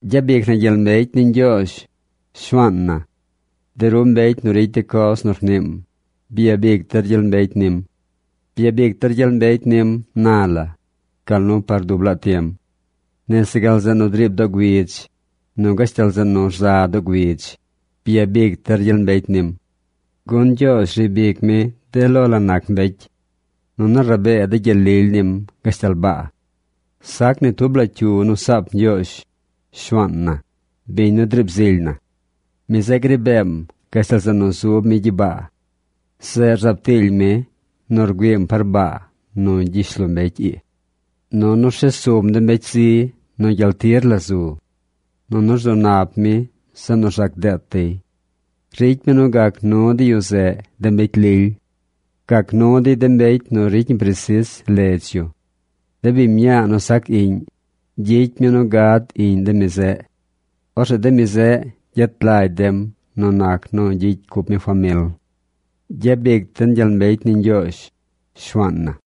¡Gyabic na gyel mbecy ni Ñgyoozh, Shuaan na! De ru mbecy nu ricy de coz nu rniim, byabic der gyel mbecy nim. Byabic der gyel mbecy nim na la, gal nu par dub laa tiem. Nese gal zeꞌ nu driib doo güidz, nu gashtal zeꞌ nu rza doo güidz, byabic der gyel mbecy nim. Gun Ñgyoozh riib ic mi de lo la nac mbecy. Nunu rabee de gyel lily nim gashtal baa. Sac ni tub la cyu nu saap Ñgyoozh, Shuaan na, biñ nu driib zily na. Mi zeꞌ gri beem gashtal zeꞌ nu zub mi gyibaa. Zeꞌ rzaab tiily mi nu rgüiim par baa nu gyishlombecy ii. Nunu rshes sum de mbecy zi nu gyel tir la zu. Nunu rzu nap mi zeꞌ nu rzac deet dey. Ricy mi nu gac nu de yu zeꞌ de mbecy lily. Gac nu dey de mbecy nu ricy ñi presis ledz yu. De biñ mñaa nu sac iꞌñ, gyicy mi nu gad iꞌñ de mi zeꞌ. Orzeꞌ de mi zeꞌ gyet lagy dem nu nac nu gyicy cup mi famil. ¡Gyabic den gyel mbecy ni Ñgyoozh, Shuaan na!